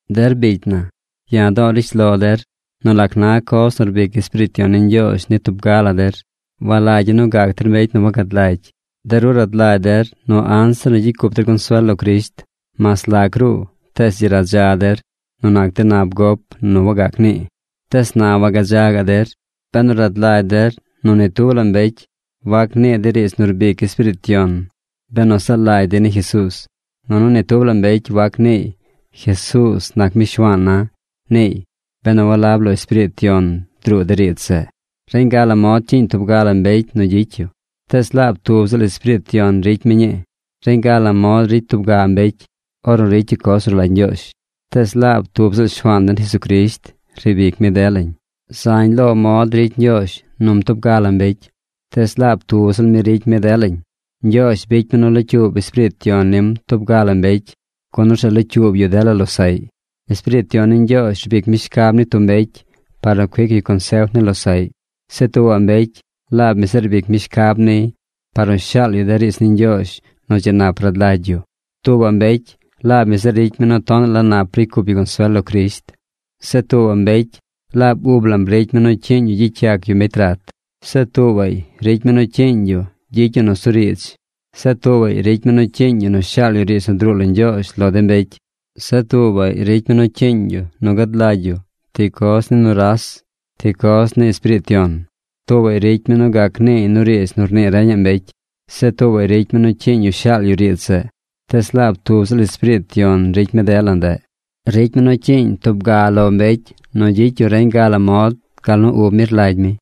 Der bicy na, ya̱ do̱o̱ rishlo der nu lac na coz nu rbic Espiriit Yon ni tub ga la der. Walagya̱ nu gac der mbecy nu wagad lagy. De ru rad lagy der nu anzir nu gyicy cup der consuel lo Crisht, mas lac ruu tees dzi radza der nu nac de nab gop nu wagac nii. Tees na wagadza gaꞌ der, benu rad lagy der nu ni tub la mbecy wac nii dey riidz nu rbic Espiriit Yon benu zaa lagy dey ni Jesuuz, nunu ni tub la mbecy wac niiy: “Jesuuz nac mi Shuaan na”, niiy, benu walab lo Espiriit Yon druu de riidz zeꞌ. Reñ ga la mod cyiiñ tub ga la mbecy nu gyicy yu, tees laab tub ziꞌl Espiriit Yon ricy mi ñii. Reñ ga la mod ricy tub ga mbecy ornu ricy yu coz nu rlagy Ñgyoozh, tees laab tub ziꞌl Shuaan den Jesucrisht riib ic mi delañ. Zañ lo mod ricy Ñgyoozh num tub ga la mbecy, tees laab tub ziꞌl mi ricy mi delañ. Ñgyoozh bicy mi nu locyuub Espiriit Yon nim tub ga la mbecy, gun orzeꞌ locyuub yu dela losaꞌy. Espiriit Yon rbic mi shcab ni tub mbecy par nu cuic yu consef ni losaꞌy. Zeꞌ tuubaꞌ mbecy, laab mi zeꞌ rbic mi shcab niy par nu shaal yu de riidz ni Ñgyoozh nu dzi nap rad lagy yu. Tuubaꞌ mbecy, laab mi zeꞌ ricy mi nu tonaꞌ la nap ricy cup yu consuel lo Crisht. Zeꞌ tuubaꞌ mbecy, laab ub lam ricy mi nu cyiiñ yu gyicy yac yu mbecy rat. Zeꞌ tuubaꞌy ricy mi nu cyiiñ yu gyicy yu nusuriidz. Zeꞌ tuubaꞌy ricy mi nu cyiiñ yu nu shaal yu riidz nu druu lo Ñgyoozh lo de mbecy. Zeꞌ tuubaꞌy ricy mi nu cyiiñ yu nu gad lagy yu ti coz ni nuras, ti coz ni Espiriit Yon. Tuubaꞌy ricy mi nu gac niiy nu riidz nu rnii reñaꞌ mbecy. Zeꞌ tuubaꞌy ricy mi nu cyiiñ yu shaal yu riidz zeꞌ. Tees laab tub ziꞌl Espiriit Yon ricy mi dela ndeꞌ. Ricy mi nu cyiiñ tub ga lo mbecy nu gyicy yu reñ ga la mod gal nu ub mi rlagy mi.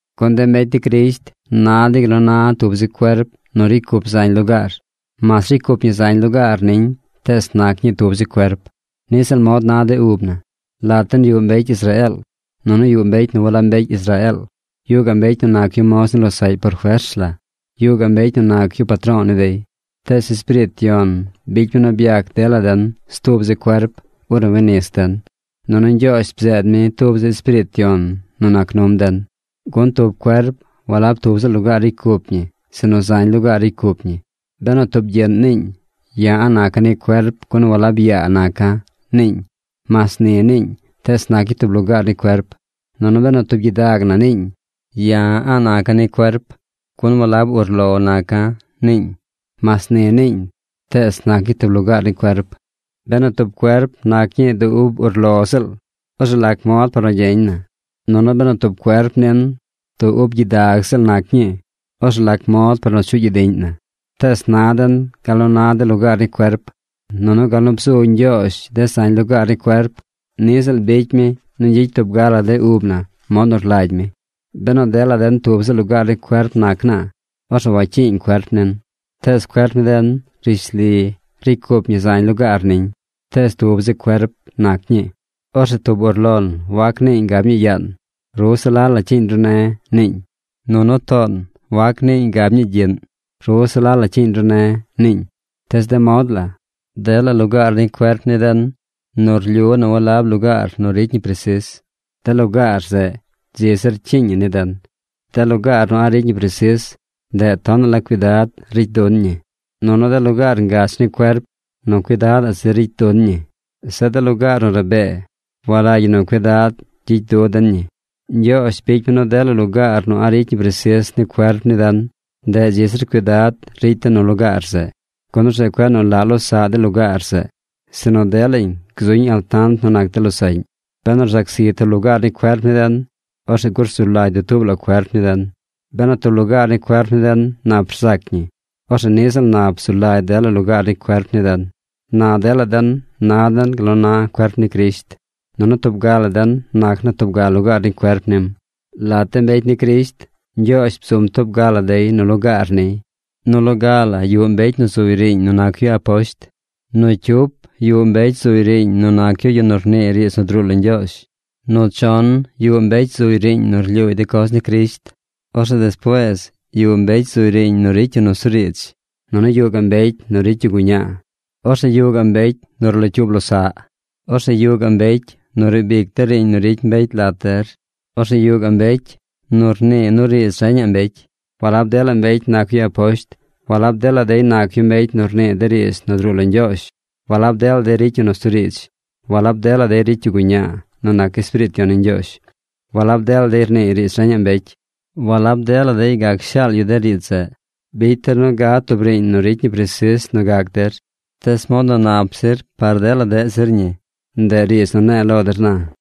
Gun de mbecy ni Crisht na dey gal nu na tub zi cuerp nu ricy cup zañ lugaar. Mas ricy cup ñi zañ lugaar niñ tees nac ñii tub zi cuerp. Niꞌ ziꞌl mod na de ub na. Lat den yuꞌ mbecy Israeel. Nunu yuꞌ mbecy nu walab mbecy Israeel. Yuꞌ gaꞌ mbecy nu nac yu moz ni losaꞌy por fers la. Yuꞌ gaꞌ mbecy nu nac yu patro̱o̱ ni dey. Tees Espiriit Yon bicy mi nu byac dela den stub zi cuerp ornu wi nis den. Nunu Ñgyoozh bzeed mi tub zi Espiriit Yon nu nac num den. Gun tub cuerp walab tub ziꞌl lugaar ricy cup ñi sinu zañ lugaar ricy cup ñi. Benu tub gyiꞌn niiñ: “Ya̱ a̱ꞌ naca̱ ni cuerp, gun walab yaa naca̱”, niiñ. Mas ni niiñ tees nac ñii tub lugaar ni cuerp. Nunu benu tub gyidag na niiñ: “Ya̱ a̱ꞌ naca̱ ni cuerp, gun walab urlo naca̱”, niiñ. Mas ni niiñ tees nac ñii tub lugaar ni cuerp. Benu tub cuerp nac ñii du ub urlo ziꞌl, orzeꞌ ¿lac mod par nu gyeñ na? Nunu benu tub cuerp nin du ub gyidag ziꞌl nac ñii, orzeꞌ ¿lac mod par nu chuꞌ gyidiꞌñ na? Tees na den gal nu na de lugaar ni cuerp. Nunu gal nu bzu Ñgyoozh de zañ lugaar ni cuerp, ni ziꞌl bicy mi nu gyicy tub ga la de ub na mod nu rlagy mi. Benu dela den tub ziꞌl lugaar ni cuerp nac naa, orzeꞌ wacyiiñ cuerp nin. Tees cuerp ni den rishli, ricy cup ñi zañ lugaar niñ, tees tub zi cuerp nac ñii. Orzeꞌ tub urlon wac niiñ gab ñii yaan: “Ru se la la cyiiñ ru ne̱”, niiñ. Nunu toon wac niiñ gab ñii gyiꞌn: “Ru se la la cyiiñ ru ne̱”, niiñ. Tees de mod la, dela lugaar ni cuerp ni den nu rlyu nu walab lugaar nu ricy ñi presis, de lugaar zeꞌ dzi zir cyiiñ ñi ni den. De lugaar nu a̱ꞌ ricy ñi presis, ndeꞌ tonaꞌ la cuidad ricy dun ñi, nunu de lugaar ngach ni cuerp nu cuidadaꞌ zir ricy dun ñi. Zeꞌ de lugaar nu rabee, walagy ñi nu cuidad gyicy nu den ñi. Ñgyoozh bicy mi nu dela lugaar nu a̱ꞌ ricy ñi presis ni cuerp ni den, ndeꞌ dzi zir cuidad ricy den nu lugaar zeꞌ. Gun orzeꞌ cueꞌ nu laꞌ losaꞌ de lugaar zeꞌ. Sinu delañ gzuñ altant nu nac de losaꞌñ. Benu rzac zi tub lugaar ni cuerp ni den, orzeꞌ gur zu lagy dutuub la cuerp ni den. Benu tub lugaar ni cuerp ni den nap rzac ñi, orzeꞌ niꞌ ziꞌl nap zu lagy dela lugaar ni cuerp ni den. Na dela den na den gal nu na cuerp ni Crisht, nunu tub ga la den nac naa tub ga lugaar ni cuerp nim. Lat de mbecy ni Crisht, Ñgyoozh bzum tub ga la dey nu lugaar niy. Nu loga la yuꞌ mbecy nu zuy riiñ nu nac yu aposht. Nu cyup yuꞌ mbecy zuy riiñ nu nac yu yu nu rnii riidz nu druu lo Ñgyoozh. Nu chon yuꞌ mbecy zuy riiñ nu rlyuuy de coz ni Crisht. Orzeꞌ despuees yuꞌ mbecy zuy riiñ nu ricy yu nusuriidz. Nunu yuꞌ gaꞌ mbecy nu ricy guñaa. Orzeꞌ yuꞌ gaꞌ mbecy nu rlocyuub losaꞌ. Orzeꞌ yuꞌ gaꞌ mbecy nu riib ic de riiñ nu ricy mbecy lat der. Orzeꞌ yuꞌ gaꞌ mbecy nu rnii nu riidz reñaꞌ mbecy. Walab dela mbecy nac yu aposht. Walab dela dey nac yu mbecy nu rnii de riidz nu druu lo Ñgyoozh. Walab dela dey ricy yu nusuriidz. Walab dela dey ricy yu guñaa nu nac Espiriit Yon ni Ñgyoozh. Walab dela dey rniiy nu riidz reñaꞌ mbecy. Walab dela dey gac shaal yu de riidz zeꞌ. Bicy der nu gad tub riiñ nu ricy ñi presis nu gac der. Tees mod nu nap zir par dela deꞌ zir ñi, ndeꞌ riidz nu ne̱e̱ lo der na.